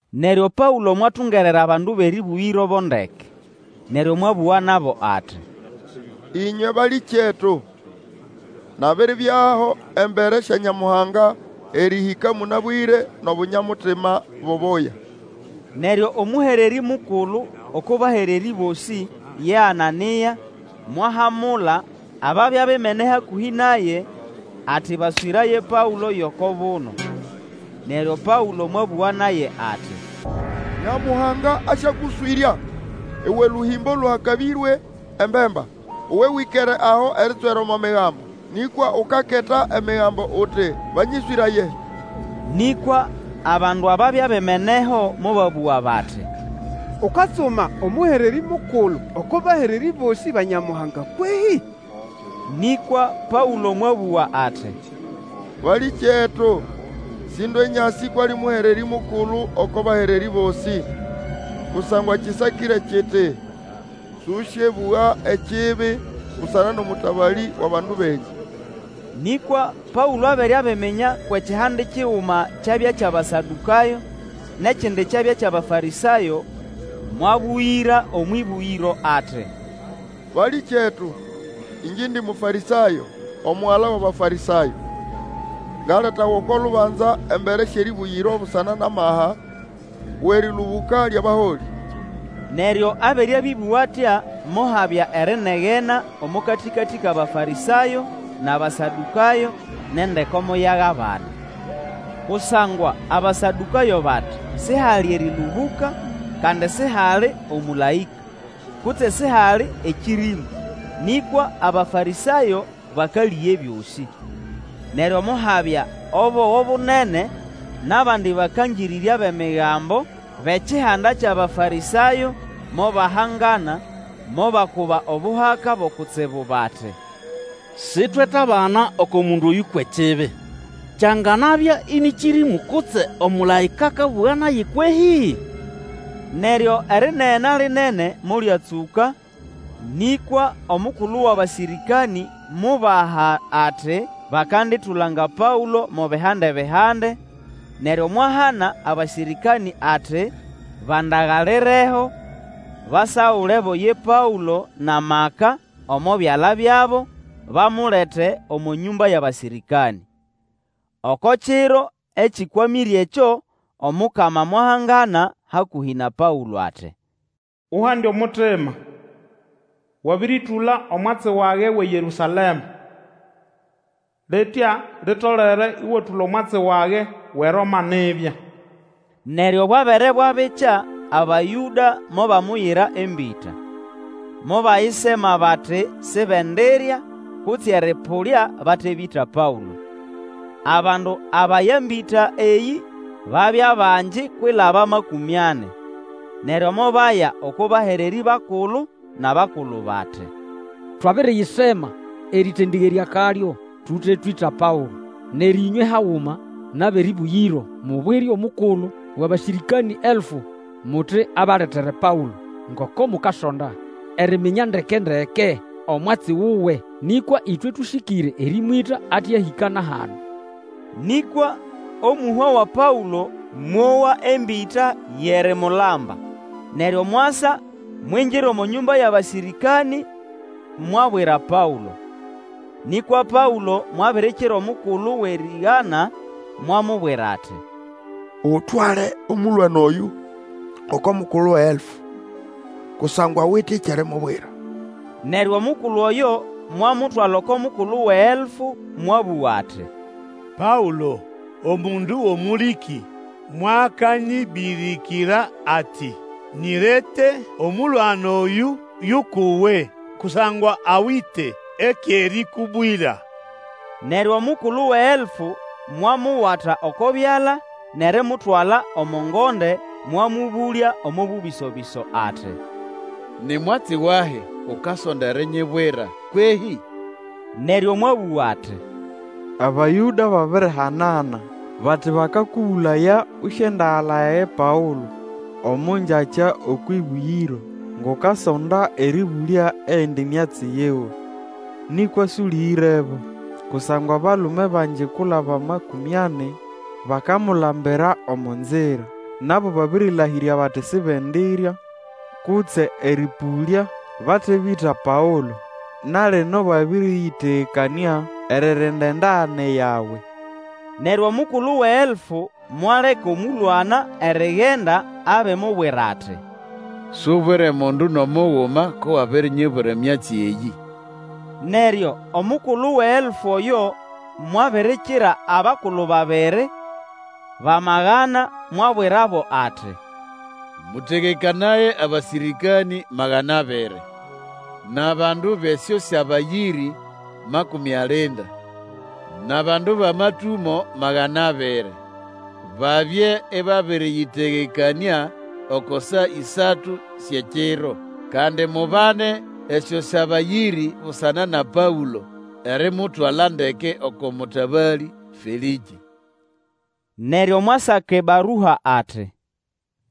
Neryo Paũlo mwatungerera bandu bʼerĩbũgĩro bo ndeke, neryo mwabũga nabo ati, Ĩnywe balĩkyetu! Nabiribyaho embere sya Nyamuhanga erĩhĩka mũnabwĩre nʼobunya-mutima bubuya. Neryo omũhererĩ mukulu oko bahererĩ bosĩ, ye Anania, mwahamula ababya bimene hakũhĩ naye ati baswĩraye Paũlo yʼoko buno. Neryo Paũlo mwabũga naye ati, Nyamuhanga asyakũswĩrya, uwe lũhĩmbo lũhakabĩrye embemba! Uwe wĩkere aho erinyitswera omo Migambo, nĩkwa ukakota Emigambo uti banyĩswĩraye! Nĩkwa abandu ababya bimeneho mobabũga bati, Ukatsuma omũhererĩ mukulu oko bahererĩ bosĩ ba Nyamuhanga kwehĩ? Nĩkwa Paũlo mwabũga ati, Balĩkyetu sĩndwe nyasĩ kwʼali mũhererĩ mukulu oko bahererĩ bosĩ. Kusangwa kĩsakĩre kiti, Sũsyebũga ekibi busana nʼomũtabalĩ wʼabandu benyu. Nĩkwa Paũlo abere abiminya kwʼekihande kiguma kyabya kyʼAbasadũkayo nʼekindi kyabya kyʼAbafarĩsayo, mwabũgĩra omwʼĩbũgĩro ati, Balĩkyetu! Ĩngye indi Mũfarĩsayo, omugala wʼAbafarĩsayo. Ngaletawa oko lubanza embere syʼerĩbũgĩro busana nʼamaha wʼerĩlũbũka lyʼabaholĩ! Neryo abere abĩbũga atya, mohabya erinegena omo katĩkatĩ kʼAbafarĩsayo nʼAbasadũkayo, nʼendeko moyagabana. Kusangwa Abasadũkayo bati, Sihali erĩlũbũka, kandi sihali omũlaĩka, kutse sihali ekĩrĩmũ; nĩkwa Abafarĩsayo bakalĩga ebyosĩ. Neryo mohabya obogo bunene, nʼabandi bakangĩrĩrya bʼEmigambo bʼekihanda kyʼAbafarĩsayo mobahangana mobakuba obuhaka bo kutsibu bati, Sitwetabana oko mundu oyũ kwʼekibi. Kyanganabya ĩnĩ kĩrĩmũ kutse omũlaĩka akabũga naye kwehĩ? Neryo erinegena lĩnene molyatsũka, nĩkwa omukulu wʼabasĩrĩkanĩ mubaha ati bakanditulanga Paũlo mo bihande-bihande, neryo mwahana abasĩrĩkanĩ ati bandagalireho basagulebo ye Paũlo nʼamaka omo byala byabo, bamulete omo nyũmba yʼabasĩrĩkanĩ. Oko kiro ekĩkwamĩre ekyo, Omukama mwahangana hakũhĩ na Paũlo ati, Uhande omutima! Wabĩrĩtũla omwatsi wage wʼeYerũsalema, litya litolere ĩwatũla omwatsi wage wʼeRoma nibya. Neryo bwabere bwabikya, Abayũda mobamuyira embĩta. Mobayisema bati sibendirya kutse erĩpũlya bate bĩta Paũlo. Abandu abaya embĩta eyĩ babya bangi kwilaba makũmi ani. Neryo mobaya oko bahererĩ bakulu nʼabakulu bati, Twabiriyisema erĩtendĩgerya akalyo tute twĩta Paũlo. Neryo ĩnywe haguma nʼabʼerĩbũgĩro mubwire omukulu wʼabasĩrĩkanĩ elfu muti abaletere Paũlo, ngoko mukasonda eriminya ndeke-ndeke omwatsi wuwe. Nĩkwa ĩtwe tũsĩkĩre erĩmwĩta ate ahĩka na hano. Nĩkwa omũhwa wa Paũlo mowa embĩta yʼerimulamba, neryo mwasa, mwingira omo nyũmba yʼabasĩrĩkanĩ, mwabwira Paũlo. Nĩkwa Paũlo mwabirikira omukulu wʼerĩgana, mwamubwira ati, Utwale omũlwana oyũ oko mukulu wʼeelfu, kusangwa awite ekyʼerimubwira. Neryo omukulu oyo mwamutwala oko mukulu wʼeelfu mwabũga ati, Paũlo, omundu wʼomũlĩkĩ, mwakanyibirikira ati, nyirete, omũlwana oyũ yʼukʼuwe kusangwa awite ekyʼerikubwira. Neryo omukulu wʼeelfu mwamuwata oko byala nʼerimutwala omo ngonde, mwamũbũlya omo bũbĩso-bĩso, ati, Ni mwatsi wahi ukasonda erinyibwira kwehĩ? Neryo mwabũga ati, Abayũda babirihanana bati bakakũbũlaya ũsyendagalaya ye Paũlo omo ngyakya okwʼĩbũgĩro ngʼukasonda erĩbũlya eyindi myatsi yiwe. Nĩkwa sũlĩgĩrebo, kusangwa abalume bangi kwilaba makũmĩ ani bakamulambira omo nzira. Nabo babĩrĩlahĩrya bati sibendirya kutse erĩpũlya bate bĩta Paũlo. Na lino babĩrĩyĩtegekanĩa eririnda endagane yawe. Neryo omukulu wʼeelfu mwaleka omũlwana erigenda abimubwira ati, Subwire mundu nʼomuguma ko wabirinyibwira emyatsi eyĩ. Neryo omukulu wʼeelfu oyo Mwabirikira abakulu babiri bʼamagana, mwabwirabo ati, Mũtegekanaye abasĩrĩkanĩ magana abiri, nʼabandu bʼesyosabayĩrĩ makũmĩ alinda, nʼabandu bʼamatũmo magana abiri, babye ĩbabĩrĩyĩtegekanĩa oko saa ĩsatu syʼekiro. Kandi mubane esyosabayĩrĩ busana na Paũlo erimutwala ndeke oko mũtabalĩ Felĩkĩ. Neryo mwasaka ebarua, ati,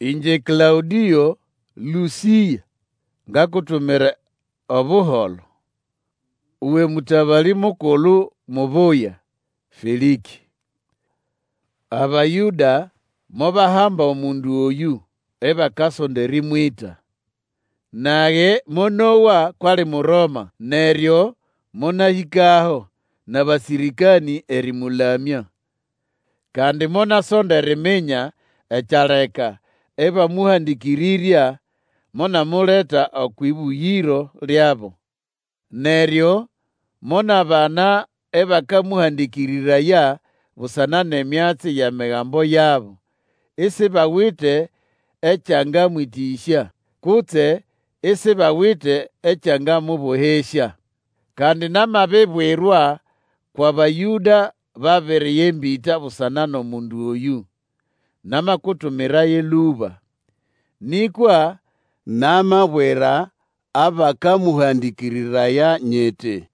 Ĩngye Klaũdĩo Lũsĩa, ngakutumira Obuholo, uwe Mũtabalĩ mukulu mubuya, Felĩkĩ. Abayũda mobahamba omundu oyũ ibakasonda erĩmwĩta. Nage monowa kwʼali Muroma, neryo monahĩkaho nʼabasĩrĩkanĩ erĩmũlamya. Kandi monasonda eriminya ekyaleka ĩbamũhandĩkĩrĩrya, monamuleta okwʼĩbũgĩro lyabo. Neryo monabana ĩbakamũhandĩkĩrĩraya busana nʼemyatsi yʼEmigambo yabo, isibawite ekyangamwĩtĩsya, kutse isibawite ekyangamũbohesya. Kandi namabibwirwa kwʼAbayũda babiriya embĩta busana nʼomundu oyũ, namakutumiraye lũba. Nĩkwa namabwira abakamũhandĩkĩrĩraya nyiti,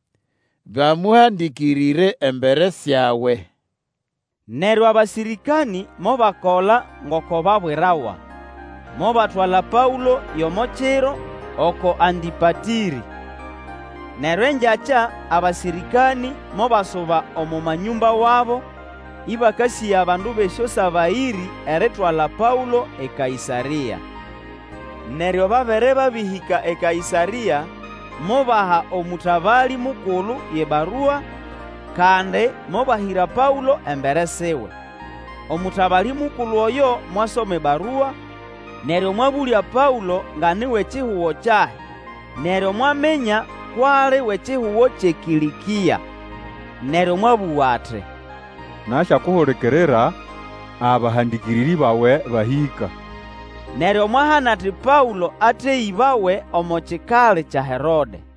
bamuhandikirire embere syawe. Neryo abasĩrĩkanĩ mobakola ngoko babwirawa. Mobatwala Paũlo yʼomo kiro oko Antĩpatĩrĩ. Neryo engyakya abasĩrĩkanĩ mobasuba omo manyũmba wabo, ĩbakasĩga bandu bʼesyosabayĩrĩ eritwala Paũlo eKaĩsarĩa. Neryo babere babĩhĩka eKaĩsarĩa, mobaha omũtabalĩ mukulu yʼebarua, kandi mobahĩra Paũlo embere siwe. Omũtabalĩ mukulu oyo mwasoma ebarua, neryo mwabũlya Paũlo nga ni wʼekihugo kyahi, neryo mwaminya kwʼali wʼekihugo kyʼeKĩlĩkĩa. Neryo mwabũga ati, Nasyakuhulikirira abahandĩkĩrĩrĩ bawe bahĩka. Neryo mwahana ati Paũlo ateyĩbawe omo kikali kya Herode.